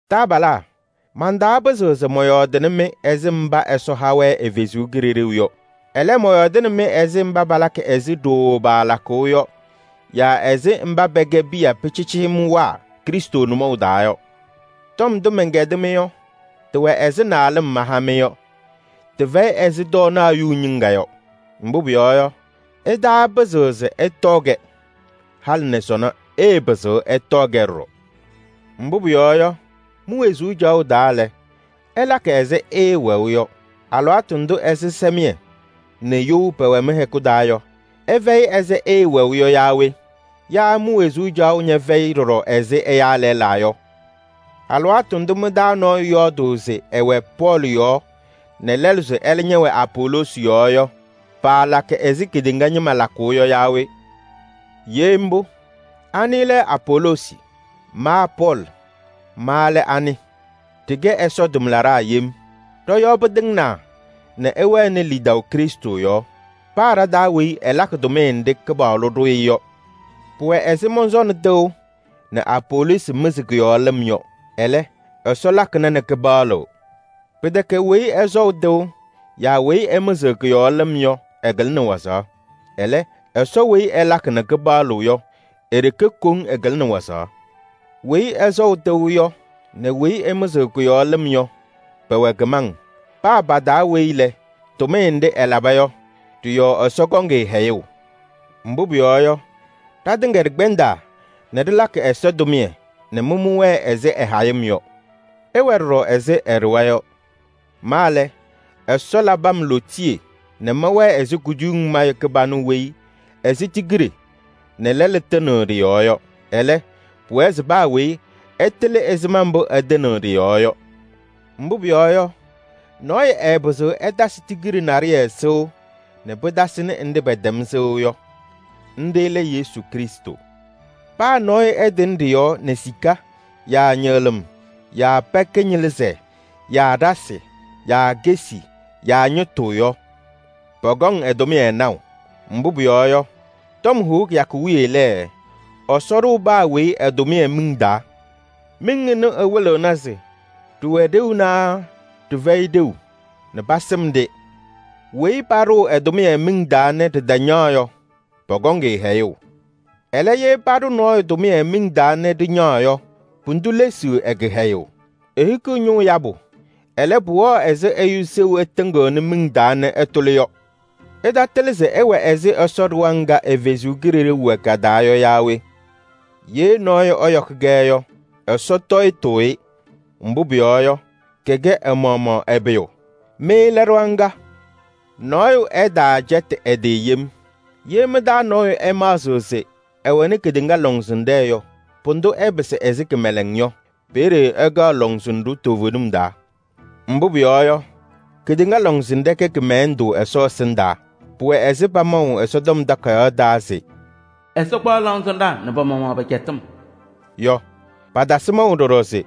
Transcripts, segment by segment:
Taabalaa, mantaapɩzɩɣ se mɔyɔɔdɩnɩ-mɩ ɛzɩ mba Ɛsɔ ha-wɛ ɛ-Kalɩzaɣ yɔ. Ɛlɛ, mɔyɔɔdɩnɩ-mɩ ɛzɩ mba palakɩ ɛzɩ ɖooo paalakʋʋ yɔ yaa ɛzɩ mba pɛkɛ piya pɩcɩɩcɩyɩmwaa Krɩstʋ nʋmɔʋ taa yɔ. Tɔm ndʋ mɛnkɛdɩ-mɩ yɔ, tɩwɛ ɛzɩ naalɩm maha-mɩ yɔ, tɩfɛyɩ ɛzɩ tɔɔnaɣ yuŋ ñɩŋga yɔ. Mbʋ pʋyɔɔ yɔ, ɩtaapɩzɩɣ se ɩtɔɔ-kɛ. Halɩ nɛ sɔnɔ ɩɩpɩzɩɣ ɩtɔɔ-kɛ ɖɔɖɔ. Mbʋ pʋyɔɔ yɔ, mi-wezuu caɣʋ taa lɛ, ɩlakɩ ɛzɩ ɩɩwɛʋ yɔ. Alɩwaatʋ ndʋ ɛzɩsɛmɩyɛ nɛ you pɛwɛ mɩ-hɛkʋ taa yɔ, ɩfɛyɩ ɛzɩ ɩɩwɛʋ yɔ yaa we? Yaa mi-wezuu caɣʋ ñɛfɛyɩ ɖɔɖɔ ɛzɩ ɛyaa lɛlaa yɔ? Alɩwaatʋ ndʋ mɩ-taa nɔɔyʋ yɔɔdʋʋ se ɛwɛ Pɔɔlɩ yɔɔ nɛ lɛlʋ se ɛlɛ ñɛwɛ Apoloosi yɔɔ yɔ, paalakɩ ɛzɩ kedeŋa ñɩma lakʋʋ yɔ yaa we? Ye mbʋ, anɩ lɛ Apoloosi? Ma Pɔɔlɩ, ma lɛ anɩ? Ɖɩkɛ Ɛsɔ tʋmlaɖaa yem ñɩma mba pɩtɩŋnɩ pɔ-yɔɔ nɛ ɩwɛnɩ lidaʋ Krɩstʋ yɔɔ yɔ. Paa ɖa-taa weyi ɛlakɩ tʋmɩyɛ nɖɩ Kɩpaɣlʋ ɖʋ-ɩ yɔ. Pʋwɛ ɛzɩ mɔsɔnɩ tɩʋ nɛ Apoloosi mɩzɩ kʋ-yɔɔ lɩm yɔ. Ɛlɛ, Ɛsɔ lakɩna nɛ kɩpaɣlɩɣ. Pɩtɛkɛ weyi ɛsɔʋ tɩʋ yaa weyi ɛmɩzɩɣ kʋ-yɔɔ lɩm yɔ, ɛkɩlɩnɩ wazaɣ. Ɛlɛ, Ɛsɔ weyi ɛlakɩ nɛ kɩpaɣlɩɣ yɔ, e-ɖeke koŋ ɛkɩlɩnɩ wazaɣ. Weyi ɛsɔʋ tɩʋ yɔ nɛ weyi ɛmɩzɩɣ kʋ-yɔɔ lɩm yɔ, pɛwɛ kɩmaŋ. Paa pa-taa weyi lɛ, tʋmɩyɛ nɖɩ ɛlaba yɔ, ɖɩ-yɔɔ Ɛsɔ kɔŋ-ɩ hɛyʋʋ. Mbʋ pʋyɔɔ yɔ, ɖatɩŋa ɖɩkpɛndaa nɛ ɖɩlakɩ Ɛsɔ tʋmɩyɛ nɛ mɩ mɩwɛɛ ɛzɩ ɛ-hayɩm yɔ. Ɩwɛ ɖɔɖɔ ɛzɩ ɛ-ɖɩɣa yɔ. Ma lɛ, Ɛsɔ labɩ-m lootiye nɛ mɛwɛɛ ɛzɩ kuduyiŋ mayʋ kɩbanʋ weyi ɛsɩ tigiɖe nɛ lɛlʋ tɩnɩɣ ɖɩ-yɔɔ yɔ. Ɛlɛ, pʋwɛɛ se paa weyi ɛtɩlɩ ɛzɩma mbʋ ɛtɩnɩɣ ɖɩ-yɔɔ yɔ. Mbʋ pʋyɔɔ yɔ, nɔɔyʋ ɛɛpɩzɩɣ ɛtasɩ tigiɖe naɖɩyɛ sɩʋ nɛ pɩtasɩnɩ nɖɩ pɛtɛm sɩʋ yɔ. Nɖɩ lɛ Yesu Krɩstʋ. Paa nɔɔyʋ ɛtɩnɩ ɖɩ-yɔɔ nɛ sika yaa ñɩɣlɩm yaa pɛɛ kɩñɩlɩzɛɛ yaa ɖasɩ yaa kesi yaa ñɩtʋ yɔ, pɔkɔŋ ɛ-tʋmɩyɛ naʋ. Mbʋ pʋyɔɔ yɔ, tɔm hʋʋ kɩyakʋ wiye lɛ, Ɛsɔ ɖʋʋ paa weyi ɛ-tʋmɩyɛ miŋ taa. Miŋ ɛnʋ ɛwɩlɩɣna se ɖɩwɛ ɖeu naa ɖɩfɛyɩ ɖeu nɛ pasɩm-ɖɩ. Weyi paɖʋʋ ɛ-tʋmɩyɛ miŋ taa nɛ ɖɩtañaɣ yɔ, pɔkɔŋ-ɩ hɛyʋʋ. Ɛlɛ, ye paɖʋ nɔɔyʋ tʋmɩyɛ miŋ taa nɛ ɖɩñaɣ yɔ, pʋdʋ lesiɣ ɛ-kɩhɛyʋʋ. Ehikiɣ ñʋʋ yabʋ, ɛlɛ, pʋwɛɣ ɛzɩ ɛyʋ seɣu ɛtɩŋɩɣnɩ miŋ taa nɛ ɛtʋlɩ yɔ. Ɩtatɩlɩ se ɩwɛ ɛzɩ Ɛsɔ ɖɩɣa ŋga ɛ-Kalɩzaɣ wɛ ka-taa yɔ yaa we? Ye nɔɔyʋ ɛyɔkɩ-kɛ yɔ, Ɛsɔ tɔyɩtʋʋ-ɩ. Mbʋ pʋyɔɔ yɔ, kɛkɛ ɛ-maɣmaɣ ɛ-pʋyʋ. Mɩ lɛ ɖɩɣa ŋga. Nɔɔyʋ ɛtaacɛtɩ ɛ-tɩ yem. Ye mɩ-taa nɔɔyʋ ɛmaɣzɩɣ se ɛwɛnɩ kedeŋa lɔŋsɩnɖɛ yɔ, pʋdʋ ɛpɩsɩ ɛzɩ kɩmɛlɛŋ yɔ. Peeye ɛkɛɣ lɔŋsɩnɖʋ toovenim taa. Mbʋ pʋyɔɔ yɔ, kedeŋa lɔŋsɩnɖɛ kɛ kɩmɛlɛndʋ Ɛsɔ ɛsɩndaa. Pʋwɛ ɛzɩ pamaʋ Ɛsɔtɔm Takayaɣ taa se: “Ɛsɔ kpaɣ lɔŋsɩnɖaa nɛ pa-maɣmaɣ pa-ajiitu” yɔ. Patasɩ maʋ ɖɔɖɔ se: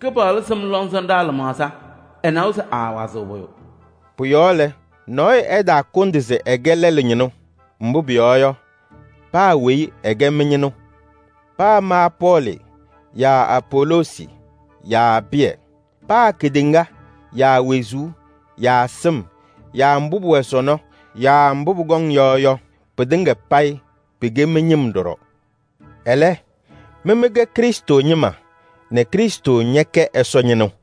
“Kɩpaɣlʋ sɩm lɔŋsɩnɖaa lɩmaɣza. Ɛnawa se aawazɩɣ pʋyʋ.” Pʋ-yɔɔ lɛ, nɔɔyʋ ɛtaakʋndɩ se ɛkɛ lɛlʋ ñɩnʋ. Mbʋ pʋyɔɔ yɔ, paa weyi ɛkɛ mɩ-ñɩnʋ: paa ma Pɔɔlɩ yaa Apoloosi yaa Pɩyɛ. Paa kedeŋa yaa wezuu yaa sɩm yaa mbʋ pʋwɛ sɔnɔ yaa mbʋ pʋkɔŋ yɔ yɔ, pɩtɩŋa payɩ pɩkɛ mɩ-ñɩm ɖɔɖɔ. Ɛlɛ, mɩ mɩkɛ Krɩstʋ ñɩma nɛ Krɩstʋ ñɛkɛ Ɛsɔ ñɩnʋ.